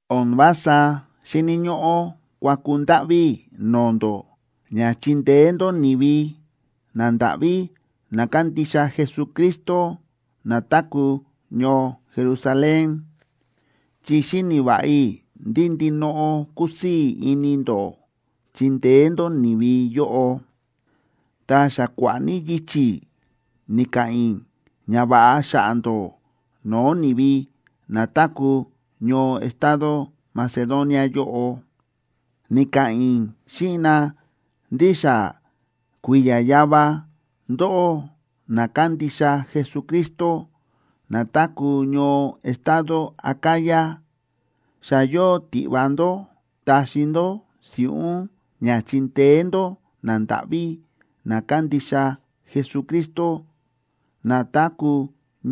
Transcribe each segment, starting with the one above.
O̱n vása xíni̱ ñóꞌó kuaku ndáꞌví i̱ no̱o̱ ndó ña chindeé ndó ni̱vi nandáꞌví na kándixa Jesucristo na táku̱ ñoo Jerusalén, chi xíni̱ va̱ꞌa i̱ ndí ndinoꞌo kúsii̱ ini ndó chindeé ndó ni̱vi yóꞌo. Ta xa kua̱ꞌa̱ ní yichi̱ ni̱ka̱ꞌa̱n i̱ ñava̱ꞌa xa̱ꞌa̱ ndó no̱o̱ ni̱vi na táku̱ ñoo estado Macedonia yóꞌo. Ni̱ka̱ꞌa̱n i̱ xíꞌin na ndí xa kui̱ya̱ yava, ndóꞌó na kándixa Jesucristo na táku̱ ñoo estado Acaya, xa yóo tiꞌva ndó taxi ndó si̱ꞌún ña chindeé ndó nandáꞌví na kándixa Jesucristo na táku̱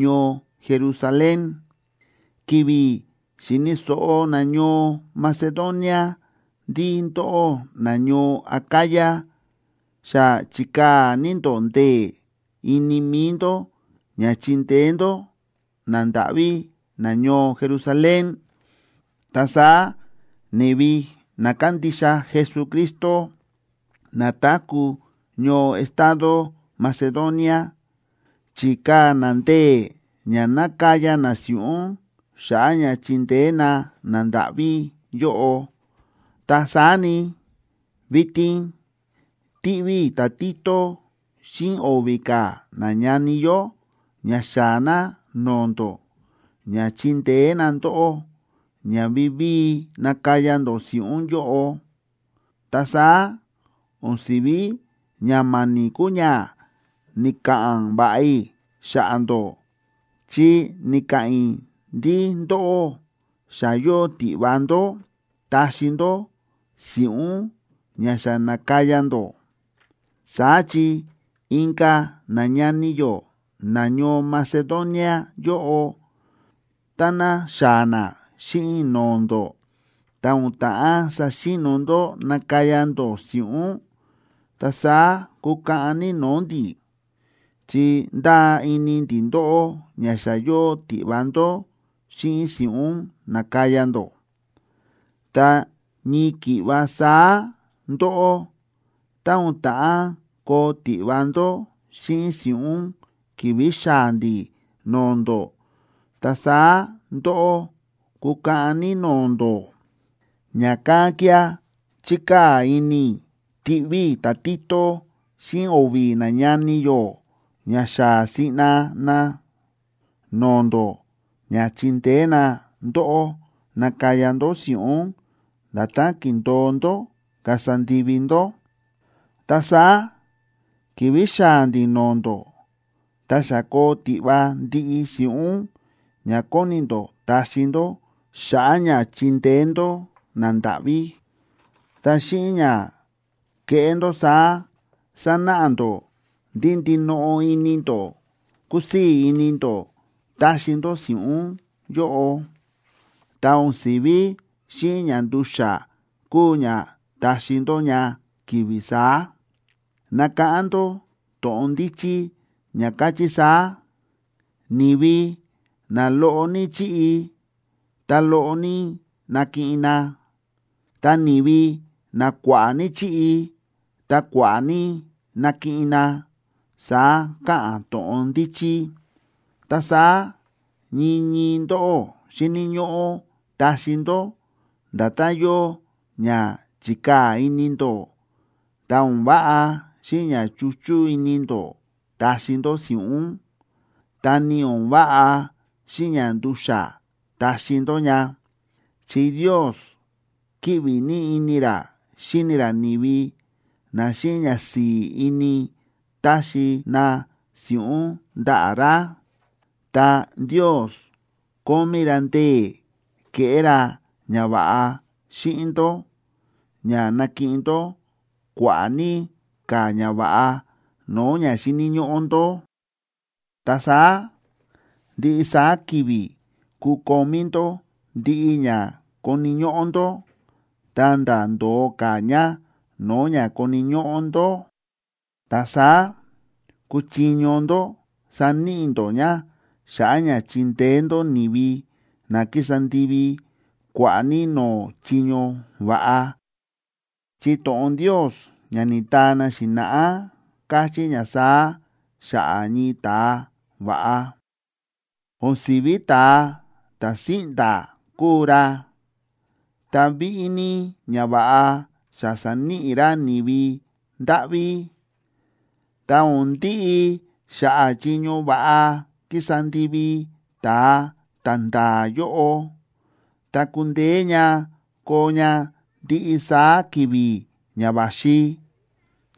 ñoo Jerusalén. Ki̱vi̱ xi̱ni̱ so̱ꞌo nañoo Macedonia ndí ndóꞌó nañoo Acaya xa chi̱kaa̱ ní ndó ndee̱ ini mi̱i ndó ña chindeé ndó nandáꞌví nañoo Jerusalén, ta saá ni̱vi na kándixa Jesucristo na táku̱ ñoo estado Macedonia chi̱kaa̱ na ndee̱ ña nákaya na si̱ꞌún xa̱ꞌa̱ ña chindeé na nandáꞌví yóꞌo. Ta saá ni, vitin tiꞌví i̱ ta̱Tito xíꞌin o̱vi̱ ka̱ nañani yó ña xaa̱ na no̱o̱ ndó ña chindeé na ndóꞌó ña vivíi nakaya ndó si̱ꞌún yóꞌo. Ta saá o̱n si̱ví ña ma̱ni̱ kuu ña ni̱ka̱ꞌa̱n va̱ꞌa i̱ xa̱ꞌa̱ ndó, chi ni̱ka̱ꞌa̱n i̱ ndí ndóꞌó xa yóo tiꞌva ndó taxi ndó si̱ꞌún ña xa na̱kaya ndó. Saá chi inka̱ nañani yó nañoo Macedonia yóꞌo, táná xaa̱ na xíꞌin i̱ no̱o̱ ndó, ta o̱n ta̱ꞌán saxi̱no̱ ndó nákaya ndó si̱ꞌún, ta saá kukaꞌan ní no̱o̱ ndi̱, chi ndáa ini ndi̱ ndóꞌó ña xa yóo tiꞌva ndó xíꞌin si̱ꞌún na̱kaya ndó. Ta ñii ki̱ꞌva saá ndóꞌó, tá o̱n ta̱ꞌán koo tiꞌva ndó xíꞌin si̱ꞌún ki̱vi̱ xaa̱ ndi̱ no̱o̱ ndó, ta saá ndóꞌó kukaꞌan ní no̱o̱ ndó. Ña̱kán kía̱ chi̱kaa̱ ini i̱ tiꞌví i̱ ta̱Tito xíꞌin o̱vi̱ nañani yó ña xaa̱ siꞌna na no̱o̱ ndó ña chindeé na ndóꞌó nakaya ndó si̱ꞌún nda̱tán ki̱ndo̱o ndó kasa ndivi ndó. Ta saá ki̱vi̱ xaa̱ ndi̱ no̱o̱ ndó, ta xa koo tiꞌva ndiꞌi si̱ꞌún ña kóni ndó taxi ndó xa̱ꞌa̱ ña chindeé ndó nandáꞌví. Ta xíꞌin ña keꞌé ndó saá, sanáꞌa ndó ndí ndinoꞌo ini ndó kúsii̱ ini ndó taxi ndó si̱ꞌún yóꞌo, ta o̱n si̱ví xíꞌin ña ndu̱xa̱ kuu ña taxi ndó ña ki̱vi̱ saá. Nakáꞌán ndó to̱ꞌon ndíchí ña káchí saá: “Ni̱vi na loꞌo ní chíꞌi, ta loꞌo ní nakiꞌin na. Ta ni̱vi na kua̱ꞌa̱ ní chíꞌi, ta kua̱ꞌa̱ ní nakiꞌin na”, saá káꞌa̱n to̱ꞌon ndíchí. Ta saá ñii ñii ndóꞌó xíni̱ ñóꞌó taxi ndó nda̱tán yóo ña chi̱kaa̱ ini ndó, ta o̱n váꞌa xíꞌin ña chuchú ini ndó taxi ndó si̱ꞌún, ta ni o̱n váꞌa xíꞌin ña ndu̱xa̱ taxi ndó ña. Chi Ndios kíꞌvi ní ini ra xíni ra ni̱vi na xíꞌin ñasi̱i̱ ini táxi na si̱ꞌún ndaꞌa̱ ra. Ta Ndios kómí ra ndee̱ keꞌé ra ñava̱ꞌa xíꞌin ndó ña nakiꞌin ndó kua̱ꞌa̱ ní ka̱ ñava̱ꞌa no̱o̱ ña xíni̱ ñóꞌó ndó. Ta saá ndiꞌi saá ki̱vi̱ kukomí ndó ndiꞌi ña koni̱ ñóꞌó ndó, ta̱nda̱ ndo̱o ka̱ ña no̱o̱ ña koni̱ ñóꞌó ndó. Ta saá kuchiño ndó saníꞌi ndó ña xa̱ꞌa̱ ña chindeé ndó ni̱vi na kísa ndivi kua̱ꞌa̱ ní no̱o̱ chiño va̱ꞌa. Chi to̱ꞌon Ndios ña ni̱taa na xi̱na̱ꞌá káchí ña saá xa̱ꞌa̱ ñii ta̱a va̱ꞌa: O̱n si̱ví ta̱a ta̱ síꞌnda̱ kúu ra, ta víꞌí ní ñava̱ꞌa xa sa̱níꞌi ra ni̱vi ndáꞌví. Ta o̱n ndiꞌi xa̱ꞌa̱ chiño va̱ꞌa kísa ndivi ta̱a ta̱nda̱a̱ yóꞌo, ta kundeé ña koo ña ndiꞌi saá ki̱vi̱ ña va̱xi,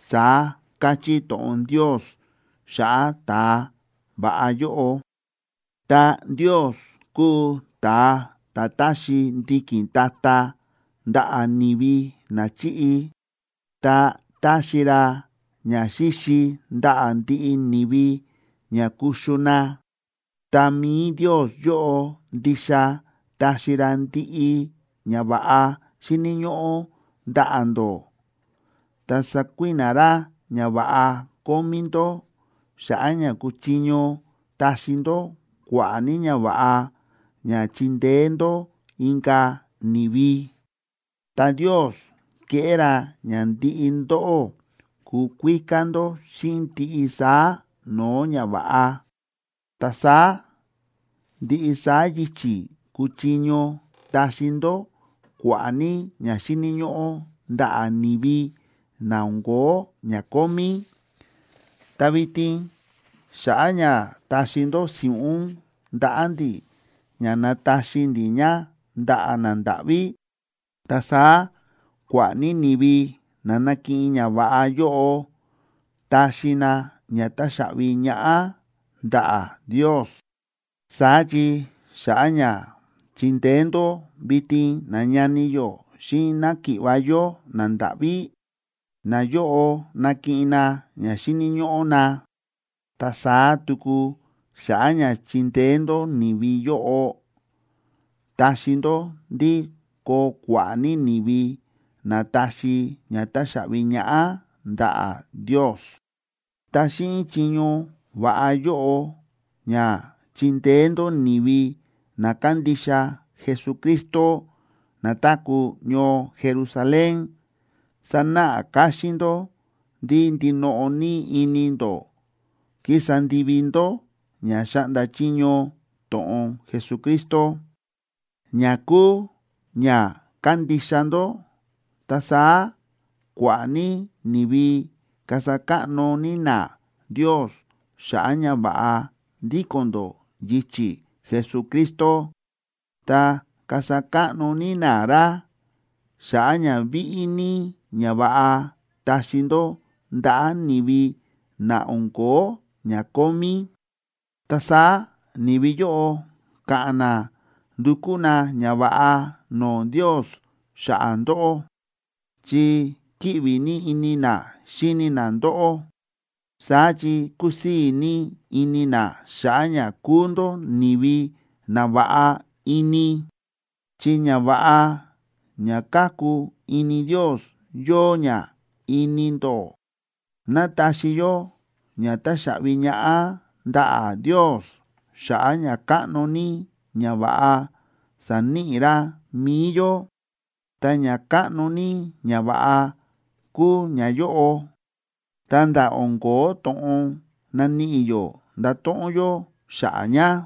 saá káchí to̱ꞌon Ndios xa̱ꞌa̱ ta̱a va̱ꞌa yóꞌo. Ta Ndios kúu ta̱a ta̱ táxi ndiki̱n ta̱ta̱ ndaꞌa̱ ni̱vi na chíꞌi, ta táxi ra ñaxíxi ndaꞌa̱ ndiꞌi ni̱vi ña kuxu na. Ta mi̱i Ndios yóꞌo ndixa taxi ra ndiꞌi ñava̱ꞌa xíni̱ ñóꞌó ndaꞌa̱ ndó, ta sakui̱na̱ ra ñava̱ꞌa kómí ndó, xa̱ꞌa̱ ña kuchiño taxi ndó kua̱ꞌa̱ ní ñava̱ꞌa ña chindeé ndó inka̱ ni̱vi. Ta Ndios keꞌé ra ña ndiꞌi ndóꞌó kukuíká ndó xíꞌin ndiꞌi saá no̱o̱ ñava̱ꞌa. Ta saá ndiꞌi saá yichi̱ kuchiño taxi ndó kua̱ꞌa̱ ní ña xíni̱ ñóꞌó ndaꞌa̱ ni̱vi na o̱n ko̱ó ña kómí. Ta vitin xa̱ꞌa̱ ña taxi ndó si̱ꞌún ndaꞌa̱ ndi̱ ña nataxi ndi̱ ña ndaꞌa̱ nandáꞌví, ta saá kua̱ꞌa̱ ní ni̱vi na nakiꞌin ñava̱ꞌa yóꞌo taxi na ña táxaꞌvi ñaꞌá ndaꞌa̱ Ndios. Saá chi xa̱ꞌa̱ ña chindeé ndó vitin nañani yó xíꞌin náki̱ꞌva̱ yó nandáꞌví, nayóꞌo nakiꞌin na ña xíni̱ ñóꞌó na. Ta saá tuku xa̱ꞌa̱ ña chindeé ndó ni̱vi yóꞌo, taxi ndó ndí koo kua̱ꞌa̱ ní ni̱vi na taxi ña táxaꞌvi ñaꞌá ndaꞌa̱ Ndios. Ta xíꞌin chiño va̱ꞌa yóꞌo ña chindeé ndó ni̱vi na kándixa Jesucristo na táku̱ ñoo Jerusalén, sanáꞌa káxín ndó ndí ndinoꞌo ní ini ndó kísa ndivi ndó ña xáꞌnda chiño to̱ꞌon Jesucristo, ña kúu ña kándixa ndó. Ta saá kua̱ꞌa̱ ní ni̱vi kasa káꞌno ní na Ndios xa̱ꞌa̱ ña va̱ꞌa ndíko̱n ndó yichi̱ Jesucristo, ta kasa káꞌno ní na ra xa̱ꞌa̱ ña víꞌí ní ñava̱ꞌa taxi ndó ndaꞌa̱ ni̱vi na o̱n ko̱ó ña kómí. Ta saá ni̱vi yóꞌo ka̱ꞌa̱n na ndukú na ñava̱ꞌa no̱o̱ Ndios xa̱ꞌa̱ ndóꞌó, chi kíꞌvi ní ini na xíni na ndóꞌó. Saá chi kusii̱ ní ini na xa̱ꞌa̱ ña kúu ndó ni̱vi na va̱ꞌa ini, chi ñava̱ꞌa ña káku ini Ndios yóo ña ini ndó. ¡Ná taxi yó ña táxaꞌvi ñaꞌá ndaꞌa̱ Ndios xa̱ꞌa̱ ñakáꞌno ní ñava̱ꞌa sa̱níꞌi ra mi̱i yó! Ta ñakáꞌno ní ñava̱ꞌa kúu ñayóꞌo, ta̱nda̱ o̱n ko̱ó to̱ꞌon naníꞌi yó ndato̱ꞌon yó xa̱ꞌa̱ ña.